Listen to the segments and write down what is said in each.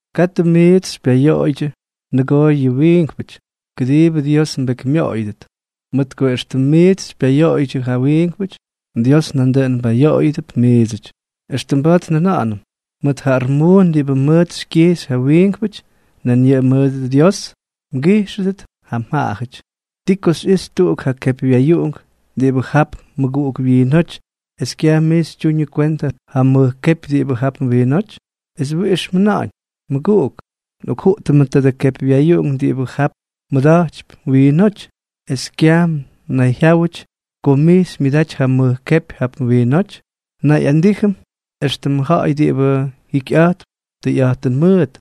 ’Katʉ miits xypyayoꞌoydyʉ nʉgoo yʉ wiinkpʉty, kʉdiibʉ Dios mbekymyoꞌoyʉdʉt. Mʉt ko éxtʉm miits xypyayoꞌoydyʉ ja wiinkpʉty, Dios nandʉꞌʉn mbayoꞌoyʉdʉp miidsʉty. Extʉm mba̱a̱t njʉna̱ꞌa̱nʉm, mʉt ja armuun diꞌibʉ mʉʉt xykyijxy ja wiinkpʉty, nan yʉꞌʉ mʉʉt Dios mgijxʉdʉt ja mjaꞌajʉty. ¿Ti ko xyꞌixy tuꞌuk ja kepywyayuꞌunk diꞌibʉ jap mmʉguꞌuk wyiinóty es kyaj mij xytyuñʉ kwentʉ ja mʉj kepy diꞌibʉ jap mwiinóty? ¿Es wiꞌix mjʉna̱ꞌa̱ñ: “Mʉguꞌuk, nꞌokjuꞌtʉmʉ tadʉ kepywyayuꞌunk diꞌibʉ jap mmʉda̱jtypy mwiinóty”, es kyaj mnayjyáwʉty ko mij xymyʉdaty ja mʉj kepy jap mwiinóty? Mnayꞌandijyʉty éxtʉmʉ ja̱ꞌa̱y diꞌibʉ jikyꞌa̱jtp tʉyꞌa̱jtʉn mʉʉt.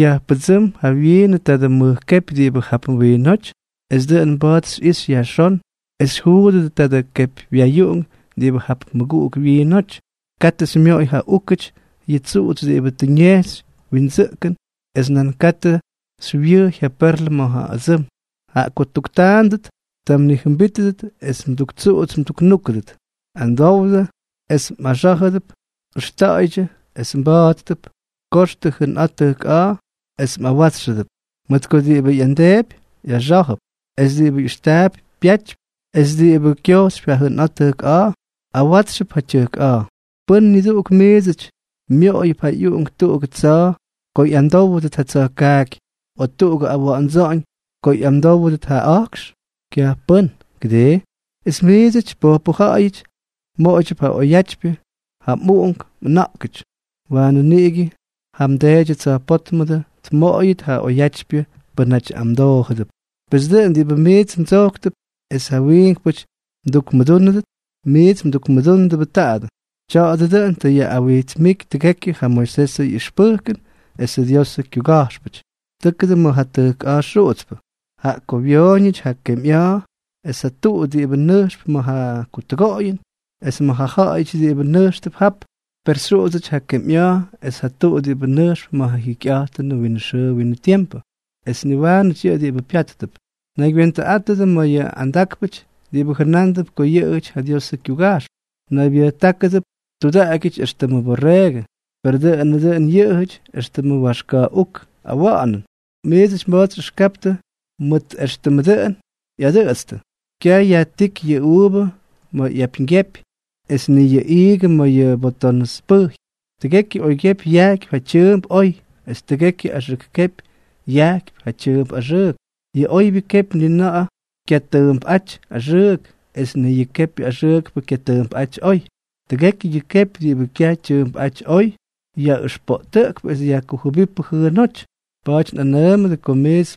Yajpʉdsʉ́m jawyiinʉ tadʉ mʉj kepy diꞌibʉ jap mwiinóty, es dʉꞌʉn mba̱a̱t xyꞌixy yajxón es xyjuudʉt tadʉ kepywyayuꞌunk diꞌibʉ jap mmʉguꞌuk wyiinóty. ’Katʉ xymyoꞌoy ja úkʉty yʉ tsuꞌutsy diꞌibʉ tʉ ñejxy windsʉꞌkʉn es nan katʉ xywyʉjy ja perlʉ ma̱ yʉ ʉdsʉm, jaꞌa ko ttuktaandʉt, ta mnijʉmbítʉdʉt es mduktsuꞌuts mduknúkʉdʉt. ’Amdowdʉ, es mꞌaxá̱jʉdʉp; ʉxta̱ꞌa̱ydyʉ, es mba̱a̱ttʉp; koxtʉ jʉnꞌa̱a̱ tʉjk a̱a̱, es mꞌawátsxʉdʉp. Mʉt ko diꞌibʉ ꞌyamdeepy, ꞌyaxá̱jʉp; es diꞌibʉ ꞌyʉxtaapy, pyatypy; es diꞌibʉ kyojxypy ja jʉnꞌa̱a̱ tʉjk a̱a̱, awátsxʉp ja tyʉjk a̱a̱. ’¿Pʉ́n niduꞌuk miidsʉty myoꞌoyʉp ja ꞌyuꞌunk tuꞌugʉ tsa̱a̱ ko ꞌyamdówdʉt ja tsa̱jkaaky, o tuꞌugʉ awa̱ꞌa̱ndsa̱ꞌa̱ñ ko ꞌyamdówdʉt ja a̱jkx? Kyaj pʉ́n, ¿kʉdii? Es miidsʉty pojpʉ ja̱ꞌa̱yʉty, mmooydyʉp ja oyatypyʉ ja mꞌuꞌunk mꞌʉna̱ꞌkʉty, waanʉ niꞌigʉ ja mDeedyʉ tsa̱jpótmʉdʉ tmoꞌoyʉt ja oyatypyʉ pʉ́nʉty amdoojʉdʉp. ’Pes dʉꞌʉn diꞌibʉ miits mdsojktʉp es ja wiinkpʉty mdukmʉdúnʉdʉt, miits mdukmʉdúndʉbʉ taadʉ. Tya̱a̱dʉ dʉꞌʉn tʉ yaꞌꞌawijtsmíky tʉgekyʉ ja Moisesʉ ꞌyʉxpʉjkʉn esʉ Diosʉ kyuga̱jxpʉty. ’Tʉ́kʉdʉ ma̱ ja tʉjk a̱a̱ xuꞌutspʉ. Jaꞌa ko wyooñʉty ja kemyꞌa̱a̱ es ja tuꞌu diꞌibʉ nʉjxp ma̱ ja kutʉgoꞌoyʉn, es may ja ja̱ꞌa̱yʉty diꞌibʉ nʉjxtʉp jap. Per xyuꞌudsʉty ja kemyꞌa̱a̱ es ja tuꞌu diꞌibʉ nʉjxp ma̱ ja jikyꞌa̱jtʉnʉ winʉ xʉʉ winʉ tiempʉ, es niwaanʉty yʉꞌʉ diꞌibʉ pyáttʉp. ’Naygywentʉꞌátʉdʉ ma̱ yʉ andákpʉty diꞌibʉ jʉnándʉp ko yʉꞌʉjʉty ja Diosʉ kyuga̱jxpʉ. Naybyʉjtákʉdʉp tudaꞌagyʉty éxtʉmʉ borreegʉ, per dʉꞌʉnʉ dʉn yʉꞌʉjʉty éxtʉmʉ waxka̱ꞌuk awa̱ꞌa̱nʉn. Miidsʉty mba̱a̱t xyꞌʉxkaptʉ mʉt éxtʉmʉ dʉꞌʉn ꞌyadʉꞌʉtstʉ. Kyaj yajtíky yʉ uuvʉ ma̱ yʉ apyñgyepy, es ni yʉ iigʉ ma̱ yʉ botonʉs pʉjy. Tʉgekyʉ oykyepy yajkypy ja tyʉʉmp oy, es tʉgekyʉ axʉk kepy yajkypy ja tyʉʉmp axʉʉk. Yʉ oybyʉ kepy ni na̱ꞌa̱ kyatʉʉmpꞌáty axʉʉk, es ni yʉ kepyʉ axʉʉkpʉ kyatʉʉmpꞌáty oy. Tʉgekyʉ yʉ kepy diꞌibʉ kyaj tyʉʉmpꞌáty oy, yaꞌʉxpoꞌtʉꞌkp es yajkujʉbípʉ jʉʉnóty. Pa̱a̱ty nꞌanʉʉmʉdʉ ko miits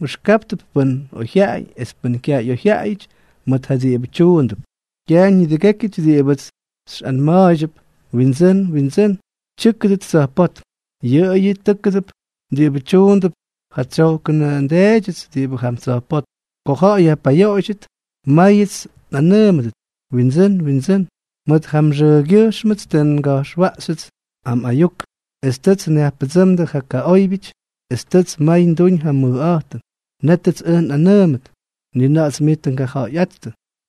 mꞌʉxkáptʉp pʉ́n oyjyaꞌay es pʉ́n kyaj ꞌyoyjyaꞌayʉty mʉt yʉ diꞌibʉ tyuundʉp. ’Kyaj nidʉgékyʉty diꞌibʉts xyꞌanma̱a̱ydyʉp: “Windsʉ́n, Windsʉ́n”, tyʉ́kʉdʉt tsa̱jpótm, yʉꞌʉyʉ tʉ́kʉdʉp diꞌibʉ tyuundʉp ja tsyojkʉnʉ nDeedyʉts diꞌibʉ jam tsa̱jpótm. Ko ja̱ꞌa̱y yajpayoꞌoydyʉt, máyʉts xyꞌanʉʉmʉdʉt: “Windsʉ́n, Windsʉ́n, mʉt ja mxʉʉgyʉjxmʉts tʉ nga̱jxwaꞌxyʉts ja mꞌayuk, es tʉts nyajpʉdsʉ́mdʉ ja kaꞌóybyʉty, es tʉts may nduñ ja mʉjꞌa̱jtʉn.” Nétʉts ʉj nꞌanʉʉmʉt: “Ni na̱ꞌa̱ts miits tʉ ngaja̱ꞌa̱yꞌáttʉ.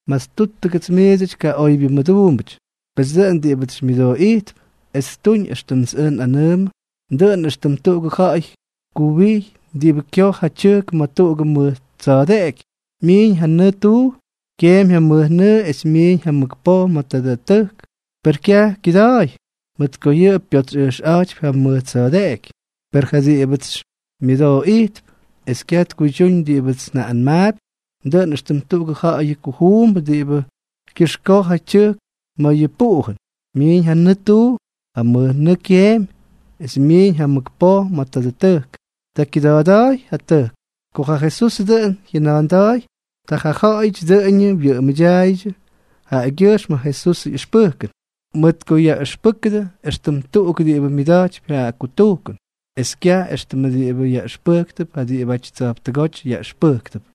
¡Mastúttʉgʉts miidsʉty kaꞌoybyʉ mʉduumbʉty!” ’Pes dʉꞌʉn diꞌibʉts xymyʉdooꞌijtp es ttuñ éxtʉmts ʉj nꞌanʉʉmʉ, dʉꞌʉn éxtʉm tuꞌugʉ ja̱ꞌa̱y kuwijy diꞌibʉ kyoj ja tyʉjk ma̱ tuꞌugʉ mʉj tsa̱a̱deꞌeky. Myiiñ ja nʉʉ tuu, kyeemy ja mʉjnʉʉ es myiiñ ja mʉk poj ma̱ tadʉ tʉjk. Per kyaj kyʉda̱a̱y, mʉt ko yʉꞌʉ pyotsyꞌʉjxꞌa̱jtypy ja mʉj tsa̱a̱deꞌeky. Per ja diꞌibʉts xymyʉdooꞌijtp es kyaj tkuydyúñ diꞌibʉts njaꞌꞌanmaapy, dʉꞌʉn éxtʉm tuꞌugʉ ja̱ꞌa̱yʉ kujuumbʉ diꞌibʉ kyʉxkoj ja tyʉjk ma̱ yʉ puꞌujʉn. Myiiñ ja nʉʉ tuu, ja mʉjnʉʉ kyeemy es myiiñ ja mʉk poj ma̱ tadʉ tʉjk. Ta kyʉda̱a̱da̱a̱y ja tʉjk. Ko ja Jesús dʉꞌʉn jyʉna̱a̱nda̱a̱y, ta ja ja̱ꞌa̱yʉty dʉꞌʉñʉ wyʉꞌʉmʉdyaaydyʉ jaꞌagyʉjxm ja Jesusʉ ꞌyʉxpʉjkʉn, mʉt ko yaꞌʉxpʉ́kʉdʉ éxtʉm tuꞌuk diꞌibʉ myʉda̱jtypy ja kutujkʉn, es kyaj éxtʉmʉ diꞌibʉ yaꞌʉxpʉjktʉp ja diꞌibʉty tsa̱jptʉgóty yaꞌʉxpʉjktʉp.